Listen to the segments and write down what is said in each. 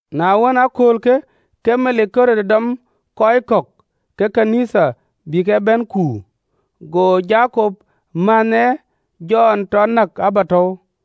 Na wën, ë aköölkë, ke melik Ɣerod dɔm kɔc kɔ̈k ke ɣön ë Nhialic bï ke bɛ̈n kuur. Go Jakop mänhë ë Jɔn tɔ näk ë abätäu.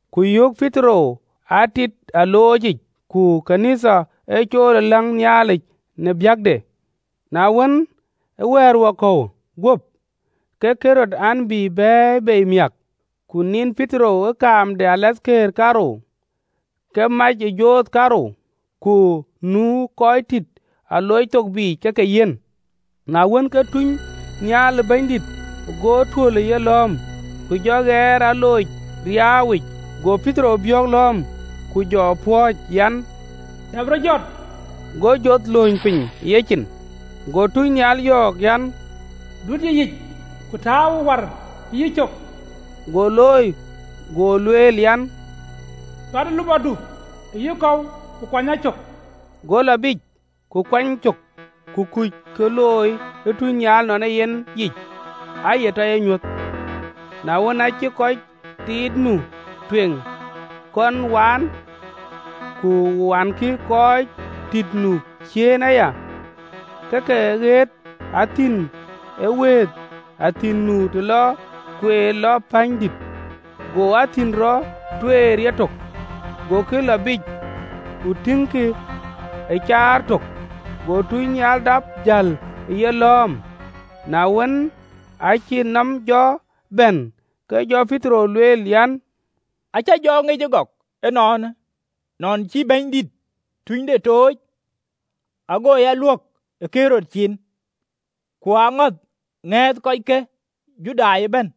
Ku yok Petero a tït aloocic. Ku ɣön ë Nhialic aa ye cool ë läŋ Nhialic në biäkde. Na wën, ee wɛ̈ɛ̈r wakɔ̈uwë guöp, ke Ɣerod an, bï bɛ̈ɛ̈i bei miäk, ku nin Petero ë kaam de kɔc ee tïït kaarou, ke amac ë joth kaarou, ku nu kɔc tit alooc thok biic ke ke yiɛ̈n. Na wën, ke tunynhial ë Bɛ̈nydït ke go tuöl ë yelɔ̈ɔ̈m, ku jɔ ɣɛɛr alooc riaauwic: go Petero biɔ̈ɔ̈k lɔ̈ɔ̈m, ku jɔ pɔ̈ɔ̈c an, “Dap rɔt jɔt!” Go joth lööny piny ë yecin. Go tunynhial yɔ̈ɔ̈k, an, “Dut yïyic, ku tääuwë war ë yïcök.” Go looi. Go lueel an, “Cuatë lupɔdu e yïkɔ̈u, ku kuany a cök.” Go lɔ biic ke kuɛny cök, ku kuc kë looi e tunynhial nɔn ee yen yic, aa ye tɔ ye nyuöth. Na wën, aa cïk kɔc tït nu tueŋ kɔn waan, ku wankï kɔc tïït nu ciëën aya, ke ke ɣet athïn ë wëëth, athïn nu të lɔ kueer lɔ pänydït. Go athïn rɔt tueer yetök, gokï lɔ biic, ku tëkkï ë kueer tök, go tunynhial dap jäl ë yelɔ̈ɔ̈m. Na wën, aacï nɔm jɔ bɛ̈n, ke jɔ Petero lueel an, “Acä jɔ ŋic ëgɔk ënɔɔnë, nɔn cï Bɛ̈nydït tunynhialde tooc, ago a luök ë Ɣerod cin, ku aŋäth ŋɛ̈ɛ̈thë kɔc ke Judai ëbɛ̈n.”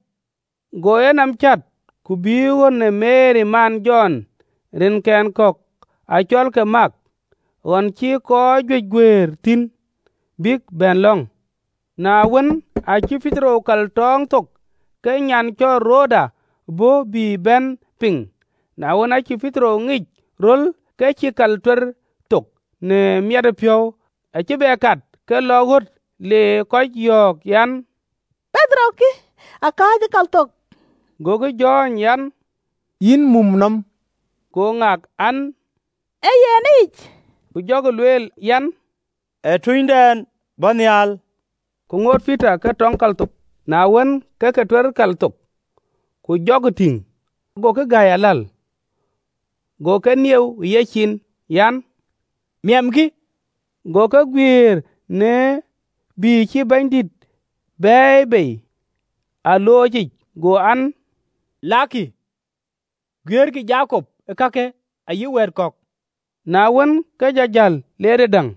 Go enɔm cät, ku bï ɣön ë Meri man Jɔn, rinkɛn kɔ̈k acɔlke Mak, ɣön cï kɔc juëc guëër thïn bïk bɛ̈n lɔ̈ŋ. Na wën, aacï Petero kal tɔɔŋ thok, ke nyan lïm cɔl Roda bɔ̈ bï bɛ̈n piŋ. Na wën, aacï Petero ŋic röl, ke cïï kal tuer thok në miɛtëpiɔ̈u, acï bɛ kat ke lɔ ɣöt, le kɔc yɔ̈ɔ̈k an, Petero kï, kääcë ë kal thok. Gokï jɔ̈ɔ̈ny an, “Yïn mum nɔm!” Go ŋak an, Ee yen ë yic, ku jɔkï lueel, an, “Ee tunydɛn bɔ̈ nhial.” Ku ŋoot Petero ke tɔŋ kal thok: na wën, ke ke tuer kal thok, ku jɔkï tïŋ, gokï gäi aläl. Go ke nieu ë yecin, an, Miɛmkï. Go ke guiëër në bïï cï Bɛ̈nydït e bɛ̈ɛ̈i bei në aloocic. Go an, “Lakkï guiëërkï Jakop kakë ayï wɛ̈ɛ̈t kɔ̈k.” Na wën, ke jɔ jäl, le tëdäŋ.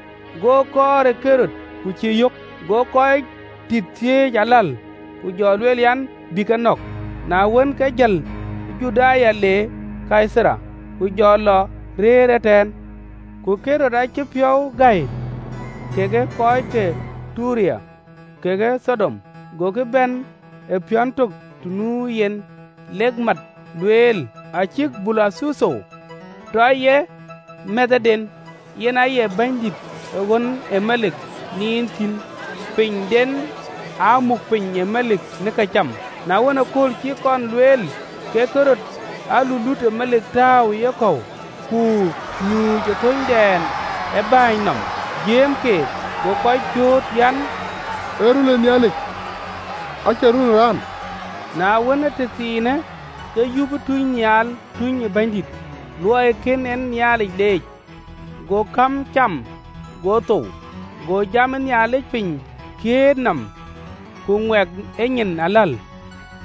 Go kɔɔr ë Ɣerod, ku cïï yök, go kɔc tït thiëëc aläl, ku jɔ lueel an, bï ke nɔ̈k. Na wën, ke lɔ Juda le Kaitharia, ku jɔ lɔ rëër ëtɛ̈ɛ̈n. Ku Ɣerod acï piɔ̈u gɔ̈ɔ̈i kekë kɔc ke Tayer kekë Thidon, gokï bɛ̈n ë piɔ̈n tök të nu yen, lek mät lueel, acïk Bulathetho tɔ ye mɛ̈thëden, yen aye bɛ̈nydïït ee ɣön yee melik nin thïn tiit, pinyden aa muk piny ë melik në këcam. Na wën, ëkööl cï kɔn lueel, ke Ɣerod jɔ alulut ë melik tääu ë yekɔ̈u, ku nyuuc ë thöönydɛn ë bɛ̈ɛ̈ny nɔm, jiëëm keek. Go kɔc cööt an, “Ee röl ë Nhialic, acie röl ë raan!” Na wën, ee tëthiinë, ke yup tunynhial de Bɛ̈nydït, luɔi kën en Nhialic leec, go käm cam, go thou. Go jam de Nhialic piny kiët nɔm ku ŋuɛk e nyin aläl.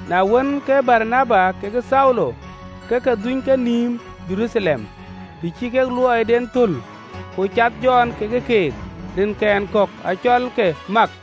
Na wën, ke Baranaba kekë Thaulo ke ke dhuny kenïïm Jeruthalem, të cï kek luɔiden thöl, ku cath Jɔn kekë keek, rinkɛn kɔ̈k acɔlke Mak.